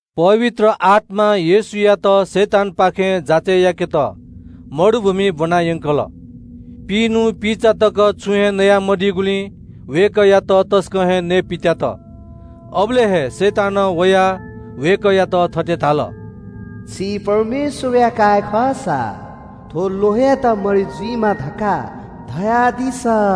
पवित्र आत्‍मां येशूयात शैतानपाखें जाँचय् याकेत मरुभूमिइ ब्‍वनायंकल। पिइन्‍हु पिइचा तक अपसं च्‍वनादीगुलिं वय्‌कःयात तसकं हे नयेपित्‍यात। अबलय् हे शैतानं वयाः वय्‌कःयात थथे धाल – “छि परमेश्‍वरया काय् खःसा थ्‍व ल्‍वहंयात मरि जुइमा धकाः धयादिसँ।”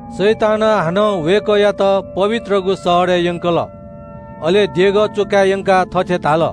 शैतानं हानं वय्‌कःयात पवित्रगु शहरय् यंकल, अले देगः च्‍वकाय् यंकाः थथे धाल –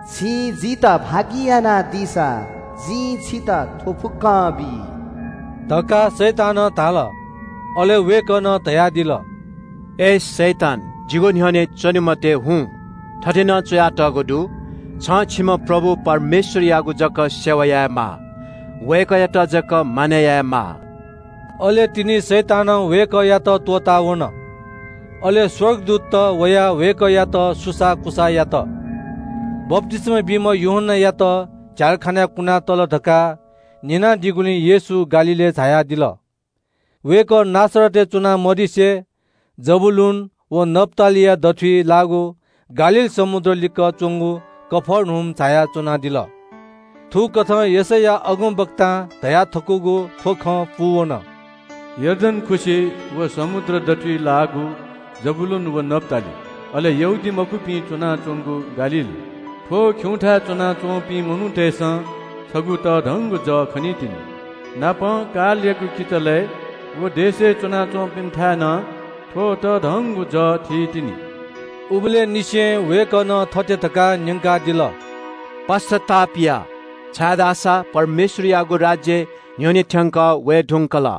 “छिं जितः भागि यानादीसा जिं छितः थ्‍व फुक्‍कं बी” धकाः शैतानं धाल। अले वय्‌कलं धयादिल – “अय् शैतान, जिगु न्‍ह्यःने च्‍वने मते, हुँ। थथे नं च्‍वयातःगु दु – “‘छं छिम्‍ह परमप्रभु परमेश्‍वरयागु जक सेवा यायेमाः। वय्‌कःयात जक मानय् यायेमाः।’” अले तिनि शैतानं वय्‌कःयात त्‍वःतावन। अले स्‍वर्गदूतत वयाः वय्‌कःयागु सेवा यात। बप्‍तिस्‍मा बीम्‍ह यूहन्‍नायात झ्‍यालखानाय् कुनातल धकाः न्‍यनादीगुलिं येशू गालीलय् झायादिल। वय्‌कः नासरतय् च्‍वना मदिसे जबूलून व नप्‍तालीया दथुइ लाःगु गालील समुद्र लिक्‍क च्‍वंगु कफर्नहुम झायाः च्‍वनादिल। थुकथं यशैया अगमवक्तां धयाथकूगु थ्‍व खँ पूवन – “यर्दन खुसि व समुद्र दथुइ लाःगु जबूलून व नप्‍ताली, अले यहूदीमखुपिं च्‍वनाच्‍वंगु गालील, थ्‍व खिउँथाय् च्‍वनाच्‍वंपिं मनूतय्‌सं छगू तःधंगु जः खनीतिनि। कालया किचलय् लाःगु देशय् च्‍वनाच्‍वंपिन्‍सं नं थ्‍व तःधंगु जः स्‍वइतिनि।” उबलय् निसें वय्‌कलं थथे धकाः न्‍यंकादिल – “पश्‍चाताप या, छाय्‌धाःसा स्‍वर्गयागु राज्‍य न्‍ह्यःने थ्‍यंकः वये धुंकल।”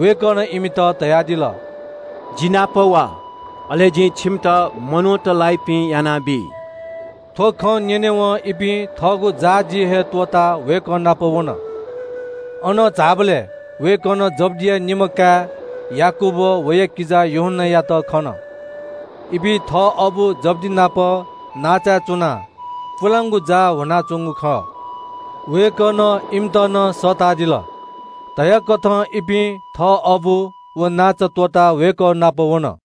वय्‌कलं इमित धयादिल – “जि नाप वा, अले जिं छिमित मनूत लाइपिं यानाबी।” थ्‍व खँ न्‍यनेवं इपिं थःगु जाःजी हे त्‍वःताः वय्‌कः नाप वन। अनं झाःबलय् वय्‌कलं जब्‍दिया निम्‍ह काय् याकूब व वया किजा यूहन्‍नायात खन। इपिं थः अबु जब्‍दि नाप नांचाय् च्‍वनाः पुलांगु जाः ल्‍ह्वनाच्‍वंगु खः। वय्‌कलं इमित नं सःतादिल। धयाकथं इपिं थः अबु व नांचा त्‍वःताः वय्‌कः नाप वन।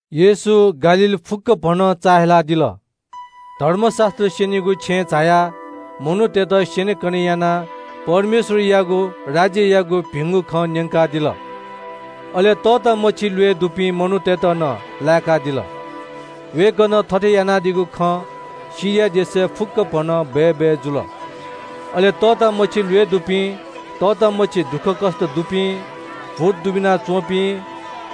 येशू गालील फुक्‍कभनं चाःहिलादिल। धर्मशास्‍त्र स्‍यनीगु छेँय् झायाः मनूतय्‌त स्‍यनेकने यानाः परमेश्‍वरयागु राज्‍ययागु भिंगु खँ न्‍यंकादिल। अले तःतामछि ल्‍वय् दुपिं मनूतय्‌त नं लाय्‌कादिल। वय्‌कलं थथे यानादीगु खँ सिरिया देशय् फुक्‍कभनं बय्‌बय् जुल। अले तःतामछि ल्‍वय् दुपिं, तःतामछि दुःखकष्‍ट दुपिं, भूत दुबिना च्‍वंपिं,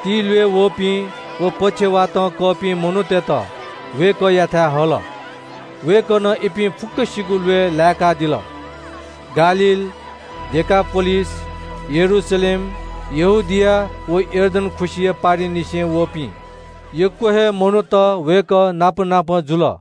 तिल्‍वय् वःपिं व पक्षवातं कःपिं मनूतय्‌त वय्‌कःयाथाय् हल। वय्‌कलं इपिं फुक्‍कसिगु ल्‍वय् लाय्‌कादिल। गालील, डेकापोलिस, यरूशलेम, यहूदिया व यर्दन खुसिया पारिंनिसें वःपिं ग्‍वाः ग्‍वाः मनूत वय्‌कः नाप नाप जुल।